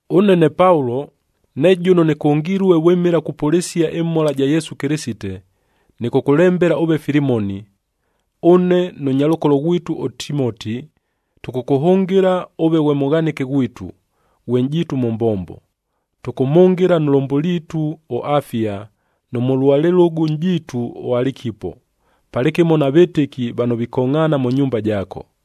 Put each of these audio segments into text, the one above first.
Ʉne ne Paulo, ne jʉno nɨkʉngilue vwɨmɨla kupʉlɨsia ɨmhola ja Yesu Kɨlɨsite, nɨkʉkʉlembela ʉve Filimoni. Ʉne nʉ nyalʉkolo ghwitu ʉTimoti, tʉkʉkʉhʉngɨla ʉve ghwe mʉghanɨke ghwitu, ghwe nʼjiitu mʉ mbombo. Tʉkʉmhʉngɨla nʉ lʉmbʉliitu ʉAfia nʉ mʉlua lɨlʉgʉ nʼjiitu ʉAlikipo, palɨkɨmo na vɨtɨki vano vikongʼhaana mʉ nyumba jaako.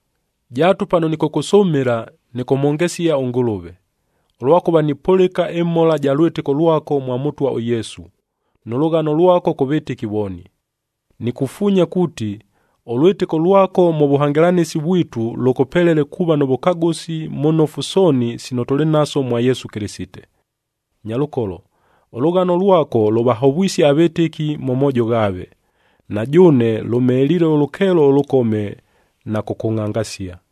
Jaatu pano nɨkʉkʉsʉmɨla, nɨkʉmhongesia ʉNgʉlʉve, ʉlwakʉva nipʉlɨka ɨmhola ja lwɨtɨko lwako mwa Mʉtwa ʉYesu, nʉ lʉghano lwako kʉ vɨtɨki vooni. Nikufuunya kuuti, ʉlwɨtɨko lwako mʉ vʉhangɨlanɨsi vwitu lʉkʉpelele kuuva nʉ vʉkagʉsi mʉ nofu sooni sino tʉlɨ naso mwa Yesu Kɨlɨsite. Nyalʉkolo, ʉlʉghano lwako lʉvahovwisie avɨtɨki mʉ moojo ghaave. Na jʉʉne, lʉmheliile ʉlʉkeelo ʉlʉkome na kʉkʉngʼhangasia.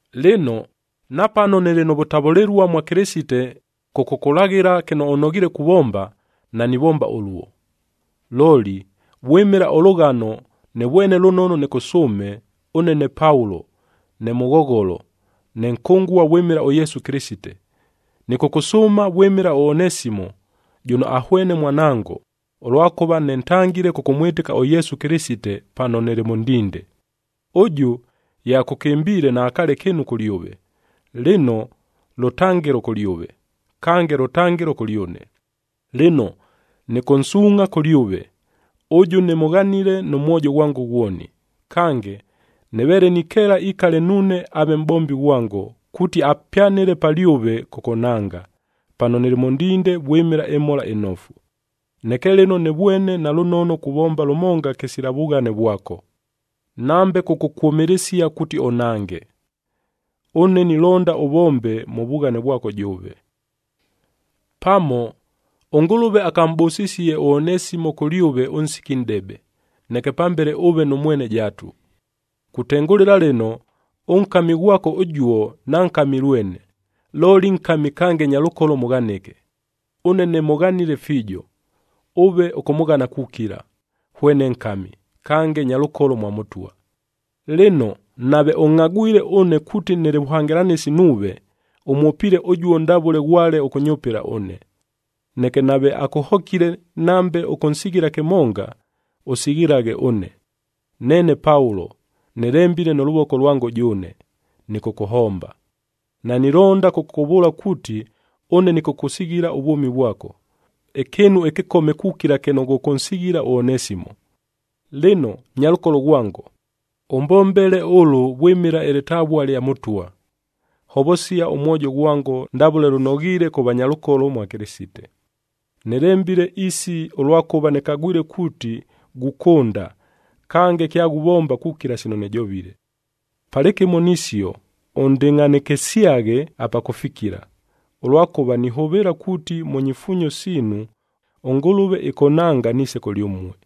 Lɨno, napano nɨlɨ nʉ vʉtavʉlɨlua mwa Kɨlɨsite kʉkʉkʉlaghɨla kɨno ʉnoghiile kuvomba, nanivomba ʉluo. Looli, vwɨmɨla ʉlʉghano nɨvwene lʉnono nɨkʉsʉʉme, ʉne ne Paulo, ne mʉghogholo, ne nkʉngua vwɨmɨla ʉYesu Kɨlɨsite. Nɨkʉkʉsʉʉma vwɨmɨla ʉOnesimo,a jʉno ahwene mwanango, ʉlwakʉva nɨntangile kʉkʉmwɨtɨka ʉYesu Kɨlɨsite pano nɨlɨ mʉ ndinde. Ʉjʉ, ye akʉkɨmbiile, naakaale kɨɨnu kʉlyʉve. Lɨno, lʉtangɨlo kʉlyʉve, kange lʉtangɨlo kʉlyʉne. Lɨno, nɨkʉnsuungʼha kʉlyʉve, ʉjʉ nɨmʉghanile nʉ mwojo ghwango ghwoni. Kange, nɨveele nikeela ikale nuune aave mʼbombi ghwango, kuuti apyanɨle palyʉve kʉkʉnhanga, pano nɨlɨ mʉ ndinde vwɨmɨla ɨMhola ɨNofu. Neke lɨno nɨvwene nalʉnono kuvomba lʉmonga kɨsila vughane vwako, nambe kʉkʉkwʉmɨlɨsia kuuti ʉnhange. Ʉne nilonda ʉvombe mʉ vughane vwako jʉʉve. Pamo, ʉNgʉlʉve akamʼbʉsisie ʉOnesimo kʉlyʉve ʉnsiki nʼdebe, neke pambele ʉʉve nʉ mwene jaatu. Kutengʉlɨla lɨno, ʉnkami ghwako ʉjuo, nankami lwene, looli nkami kange nyalʉkolo mʉghanɨke. Ʉne nɨmʉghanile fiijo, ʉve ʉkʉmʉghana kukila, hwene nkami, kange nyalʉkolo mwa Mʉtwa. Lɨno, nave ʉngʼhagwile ʉne kuuti nɨlɨ vʉhangɨlanɨsi nuuve, ʉmwʉpɨle ʉjuo ndavʉle ghwale ʉkʉnyʉpɨla ʉne. Neke nave akʉhokile, nambe ʉkʉnsighila kɨmonga, ʉsighilaghe ʉne. Neene Paulo, nɨlembile nʉ lʉvoko lwango jʉʉne, nɨkʉkʉhomba. Nanilonda kʉkʉkʉvʉʉla kuuti ʉne nɨkʉkʉsighila ʉvwʉmi vwako, ɨkɨɨnu ɨkɨkome kukila kɨno ghʉkʉnsighila ʉOnesimo. Lɨno, nyalʉkolo ghwango, ʉmbombele ʉlʉ vwɨmɨla ɨlɨtavua lya Mʉtwa. Hovosia ʉmwojo ghwango ndavʉle lʉnoghiile kʉ vanyalʉkolo mwa Kɨlɨsite. Nilemba isi, ʉlwakʉva nɨkagwile kuuti ghukʉnda, kange kyaghuvomba kukila sino nɨjovile. Palɨkɨmo nisio, ʉndɨngʼhanɨkɨsyaghe apa kʉfikila, ʉlwakʉva nihʉvɨɨla kuuti mʉ nyifuunyo siinu, ʉNgʉlʉve ɨkʉnhanga niise kʉlyʉmue.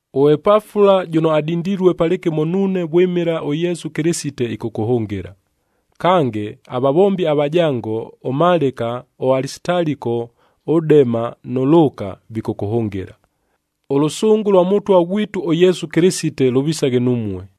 ɄEpafula jʉno adindilue palɨkɨmo nuune vwɨmɨla ʉYesu Kɨlɨsite ɨkʉkʉhʉngɨla. Kange, avavombi avajango ʉMalɨka, ʉAlisitaliko, ʉDema nʉ Lʉʉka, vikʉkʉhʉngɨla. Ʉlʉsʉngʉ lwa Mʉtwa ghwitu ʉYesu Kɨlɨsite lʉvisaghe numue.